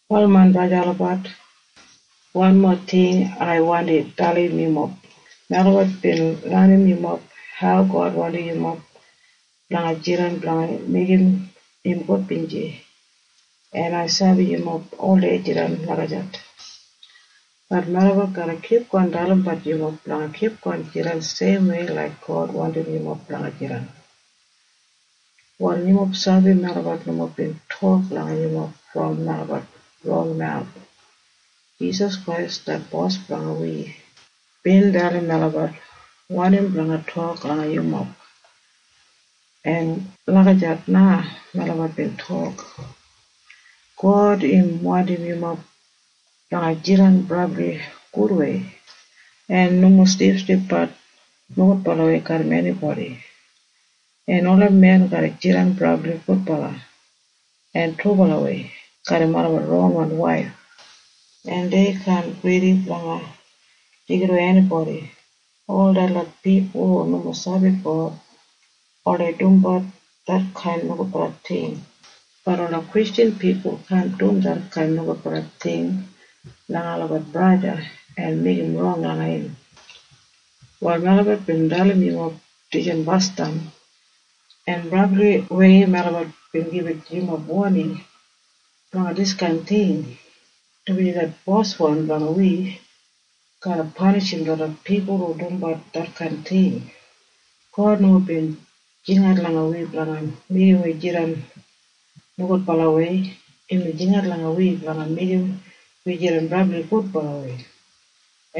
Wal main braja en sista olabat, wanmo ting ai wandi dalim yumob. Melabat bin lenim yumob hau God wandim yumob blanga jidan blanga meigim im gudbinji. En ai sabi yumob oldei jidan lagijat. Bat melabat garra kipgon dalimbat yumob blanga kipgon jidan seimwei laik God wandim yumob blanga jidan. Wal yumob sabi melabat nomo bin tok langa yumob brom melabat ron mawus. Jisas Krais det Bos blanga wi bin dalim melabat wanim blanga tok langa yumob. En lagijat na melabat bin tok. God im wandim yumob blanga jidan brabli gudwei en nomo silipsilipbat nogudbalawei garram enibodi, en ola men garra jidan brabli gudbala en trubalawei garram olabat ronwan waif, en dei kaan gridi blanga deigidawei enibodi. Ol detlot pipul hu nomo sabi God oldei dumbat detkain nogudbala ting. Bat ola Kristjan pipul kaan dum detkain nogudbala ting langa olabat braja o sista en meigim rong langa olabat. Wal melabat bin dalim yumob dijan basdam, en brabliwei melabat bin gibit yumob woning blanga diskain ting, dumaji det Boswan blanga wi garra panishim detlot pipul hu dumbat detkain ting. God nomo bin jingat langa wi blanga meigim wi jidan nogudbalawei. Imbin jingat langa wi blanga meigim wi jidan brabli gudbalawei,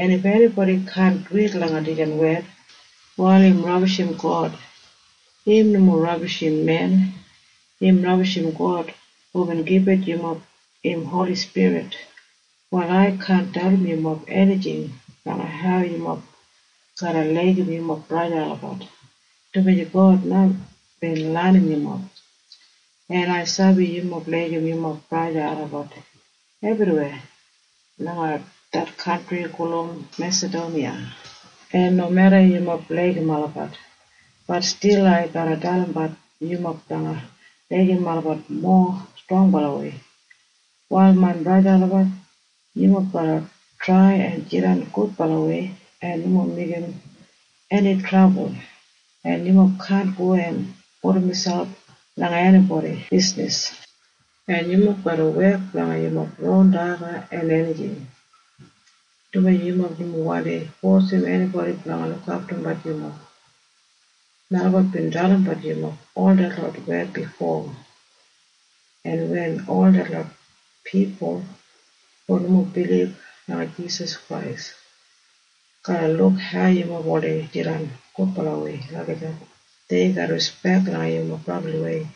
en if enibodi kaan duwit langa dijan wed, wal im rabishim God. Im nomo rabishim men. Im rabishim God hubin gibit yumob im Holi Spirit. Wal ai kaan dalim yumob enijing blanga hau yumob garra laigim yumob braja en sista olabat, dumaji God na bin lenim yumob, en ai sabi yumob laigim yumob braja en sista olabat ebriweya langa det kantri gulum Mesadoniya. En nomeda yumob laigim olabat, bat stil ai garra dalimbat yumob blanga laigim olabat mowa strongbalawei. Wal main braja en sista olabat, yumob garra trai en jidan gudbalawei en nomo meigim eni trabul, en yumob kaan go en pudum miselp langa enibodi bisnis. En yumob garra wek blanga yumob ron daga en enijing, dumaji yumob nomo wandi fosim enibodi blanga lukaftumbat yumob. Melabat bin dalimbat yumob ol detlot wed bifo, en wen ol detlot pipul hu nomo bilib langa Jisas Krais garra luk hau yumob oldei jidan gudbalawei lagijat, dei garra rispek langa yumob brabliwei.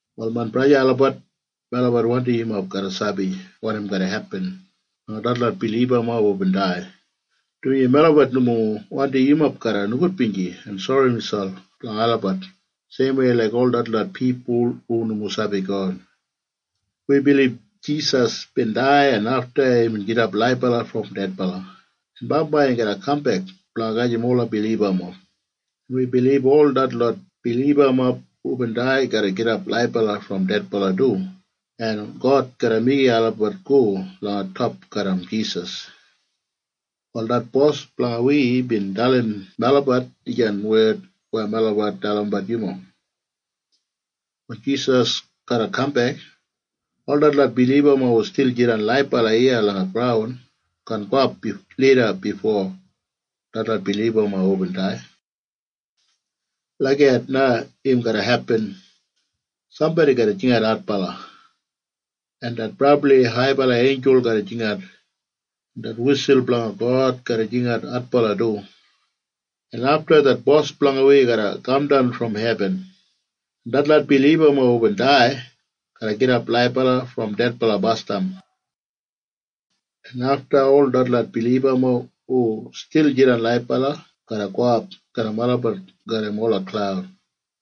Wal main braja en sista olabat, melabat wandim yumob garra sabi wanim garra hepin langa detlot bilibamob hubin dai, dumaji melabat nomo wandim yumob garra nogudbinji en sori miselp blanga olabat seimwei laik ol detlot pipul hu nomo sabi God. Wi bilib Jisas bin dai en afta imbin gidap laibala brom dedbala en bambai im garra kambek blanga gajim ola bilibamob. En wi bilib ol detlot bilibamob hubin dai garra gidap laibala brom dedbala du en God garra meigim olabat go langa top garram Jisas. Wal det Bos blanga wi bin dalim melabat dijan wed weya melabat dalimbat yumob. Wen Jisas garra kambek, ol detlot bilibamob hu stil jidan laibala iya langa graun kaan gowap lida bifo detlot bilibamob hubin dai. Lagijat na im garra hepin. Sambodi garra jingat adbala, en det brabli haibala einjul garra jingat, en det wisul blanga God garra jingat adbala du, en afta det Bos blanga wi garra kamdan brom hebin, en detlot bilibamob hubin dai garra gidap laibala brom dedbala basdam, en afta ol detlot bilibamob hu stil jidan laibala garra gowap garram olabat garram ola klaud,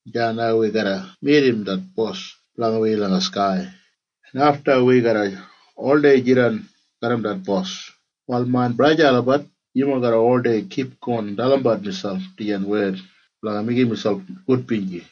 en deya na wi garra midim det Bos blanga wi langa skai, en afta wi garra oldei jidan garram det Bos. Wal main braja en sista olabat, yumob garra oldei kipgon dalimbat miselp dijan wed blanga meigim miselp gudbinji.